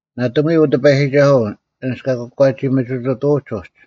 ᓇᑎᒧᐎ, ᐅ ᑎᐸᔨᒋᒐᓱᐤ, ᐊᓐᒡ ᑲ ᑯᒂᒋ ᒥᒋᑐᑐᐅᒡ ᐅᒡ;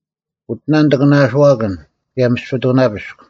ᐅᑎᓇ ᐊᒂᓇᐅᓱᐛᑭᓐ ᑭᔭ ᒥᔅᐱᑐᓇᐱᔅᒃ,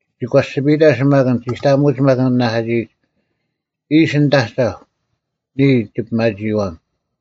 ᒋᒂᐱᔅᒋᐱᑕ ᓯᒪᑭᓐ, ᒋᑕᐊᒧᐅᒡ ᒪᒃ ᐊᓐᒡ ᑲ ᓂᓇᐧᑲᒋᐃᒡ: ᐃᓯ ᓂᑦ ᐊᒐᐧᒄ, “ᓂᔾ ᒋᐱᒪᒋᐃᐛᒻ᙮”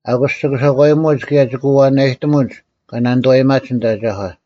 ᐊᑯᔅ ᒋᑭ ᓴᒂᔨᒧᐅᒡ ᑭᔭ ᒋᑭ ᐛᐛᓇᔨᑎᒧᒡ ᑲ ᓇᓂᑐᐛᔨᒪᒡ ᓂᑦ ᐊᒐᒂ: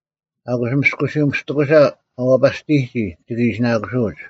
ᐊᑯᔅ ᒥᔅᑯᓱᒥᔅᑎᑯᓴ ᐊ ᐛᐸᔅᑎᔨᒋ ᒋᑭ ᐃᓯᓇᑯᓱᐛᐅᒡ;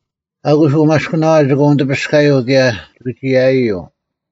ᐊᑯᔅ ᐅᒪᔅᑭᓇᐛᐤ ᒋᑭ ᐅᓂᑎᐱᔅᑲᔪᐤ ᑭᔭ ᒋᑭ ᒋᔭᐃᔪᐤ;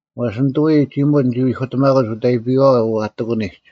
ᐛᔅ ᓂᑐᐎ ᒋᒧᑦ ᓂᒋ ᐎᑯᑎᒪᑯᒡ ᐅᑦ ᐊᐃᐱᐛᐛ ᐛᑎᑯᓂᒡ,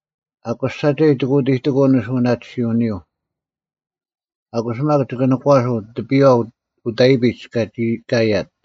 ᐊᑯᔅ ᓴᒐᔾ ᒋᑭ ᐅᑎᑎᑯᐤ ᓂᓱᐅᓇᑎᓯᐅᓂᔪᐤ; ᐊᑯᔅ ᒪᒃ ᒋᑭ ᓇᒂᓱᐤ ᑎᐱᔽ ᐅᑦ ᐊᐃᐱᒡ ᑲᒋ ᑲᔭᑦ: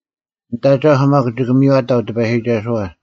ᓂᑦ ᐊᒐᐧᒄ ᒪᒃ ᒋᑭ ᒥᔽᑕᐤ ᑎᐸᔨᒋᒐᓱᐛ: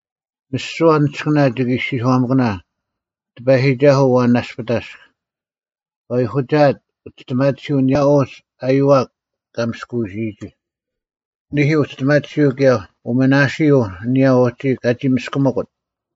ᒥᓯᐛ ᓂᔅᑭᓇ ᒋᑭ ᐃᔅᒋᔄᒪᑭᓇ, “ᑎᐸᔨᒋᒐᓱᐤ, ᐊᐛᓐ ᓇᔅᐱᑕᔅᒃ, ᑲ ᐎᒂᒋᐊᑦ ᐅᒋᔅᑎᒪᓱᐤ ᐊᓂᔭ ᐅᒋ ᐊᔪᐛᒃ ᑲ ᒥᔅᑯᐅᓯᔨᒋ, ᓂᐦᐃ, ᐅᒋᔅᑎᒪᓱᐤ ᑭᔭ ᐅᒥᓇᓯᐤ ᐊᓂᔭ ᐅᒋ ᑲᒋ ᒥᔅᑭᒥᑯᑦ?”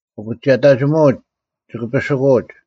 ᐅᑭᒋᔭᑕᒋᒧᐅᒡ ᒋ ᐱᓯᑯᐅᒡ;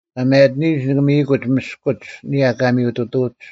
ᑲ ᒪᔭᑎᓂᔨᒡ ᓂᑭ ᒥᔨᑯᒡ ᒥᔅᑯᒡ ᐊᒋ ᒥᔪᑐᑐᐅᒡ,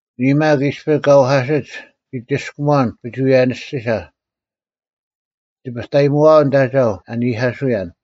ᓂᔾ ᒪᒃ, ᐃᔅᐱ ᑲ ᐊᐧᑯᓯᒡ ᓂᒋ ᒋᔅᑲᒺᓐ ᐱᒍᐎᔭᓂᔅᒋᓴ: ᓂᒋ ᑕᐸᑕᐃᒧᐊᐤ ᓂᑦ ᐊᒐᐧᒄ ᐊ ᓂᐧᑲᓱᔭᓐ;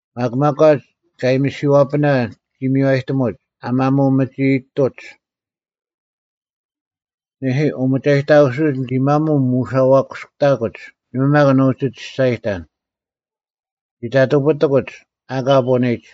ᒪᒃ ᒪᒂᒡ ᑲ ᐊᔨᒥᓯᐛᐱᓇ ᒋ ᒥᔽᔨᑎᒧᒡ, ᐊ ᒪᒧᐤ ᒪᐅᒋᐃᑐᒡ: ᓂᐦᐃ, ᐅᒪᒐᔨᑕᑯᓯᐅᒡ, ᓂᒋ ᒪᒧᐤ ᒧᐛᓴᑯᔅᑕᑯᒡ, ᓇᒪ ᒪᒃ ᓂ ᐅᒋ ᒋᔅᒐᔨᑕᓐ; ᓂᒋ ᑕᑐᐱᑎᑯᒡ, ᐊᑲ ᐳᓂᒡ;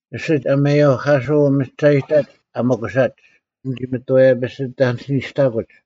ᐊᓯᒡ ᐊᔭᒥᐊᐧᑲᓱᐤ ᒪᔭᔨᒐᐅᒡ ᐊ ᒥᑯᓴᒡ, ᓂᒋ ᒪᑥᔭᐱᑕᓯᓄᔅᑕᑯᒡ᙮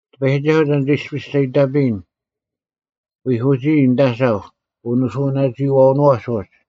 ᑎᐸᔨᒋᒐᓱᐤ, ᑕᓐ ᒐ ᐃᔅᐱᔅ ᒐ ᐃᑕᐱᔨᓐ? ᐎᐧᑯᒋᔾ ᓂᑦ ᐊᒐᐧᒄ ᐅᓂᓱᐅᓇᒋᐃᐛᐅᓄᐛᒡ ᐅᒡ,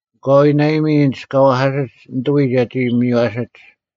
ᐊᑲᐎᔾ ᓇᐊᔨᒥᒡ ᐊᓐᒡ ᑲ ᐛᐧᑲᓯᒡ ᓂᑐᐎ ᒐᒋ ᒥᔽᓯᒡ;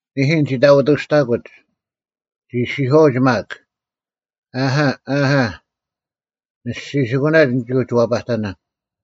ᓂᐦᐃ, ᓂᒋ ᑕᐛᑎᔅᑕᑯᒡ; ᒋ ᐃᔅᒋᔄᐅᒡ ᒪᒃ, “ᐊᐦᐊ, ᐊᐦᐊ, ᓂᔅᒋᓯᑯᓇᒡ ᓂᒋ ᐅᒋ ᐛᐸᑕᓇᓐ᙮”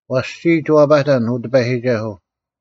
ᐅᔭ ᔅᒋ ᐛᐸᑕᓐ, ᐅ ᑎᐸᔨᒋᒐᓱᐤ: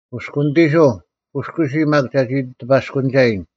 ᑯᔅᑯᓂᑎᓱᐤ, ᑯᔅᑯᓯ ᒪᒃ ᒐᒋ ᑎᐸᔅᑯᓂᒐᔨᓐ,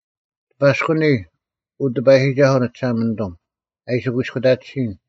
ᑎᐸᔅᑯᓂ, ᐅ ᑎᐸᔨᒋᒐᓱᐤ ᓂᒋᓴᒪᓂᑐᒻ, ᐊ ᐃᓯ ᑯᐃᔅᑯᑕᑎᓯᔨᓐ;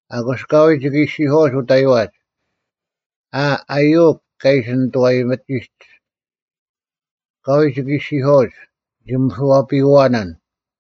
ᐊᑯᔅ ᐊᑲᐎᔭ ᒋᑭ ᐃᔅᒋᔄᐛᒡ ᐅᑕᐃᐛᒡ, “ᐊ, ᐊᔪᐅᒄ ᑲ ᐃᓯ ᓂᑐᐛᔨᒥᒋᒡ:” ᐊᑲᐎᔾ ᒋᑭ ᐃᔅᒋᔄᐅᒡ, “ᓂᒋ ᒥᓱᐛᐸᔪᐛᓇᓐ᙮”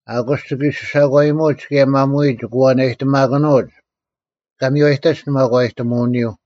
ᐊᑯᔅ ᒋᑭ ᓯᓴᒂᔨᒧᐅᒡ ᑭᔭ ᒪᒧᐎ ᒋᑭ ᐛᓇᔨᑎᒪᑭᓄᐅᒡ, ᑲ ᒥᔽᔨᑕᒡ ᓂ ᒪᒂᔨᑎᒧᐅᓂᔪᐤ: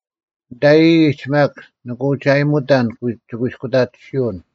ᓂᑕᔨᔨᒡ ᒪᒃ ᓂᑭ ᐅᒋ ᐊᔨᒧᑕᓐ ᒋᑯᐃᔅᑯᑕᑎᓯᐅᓐ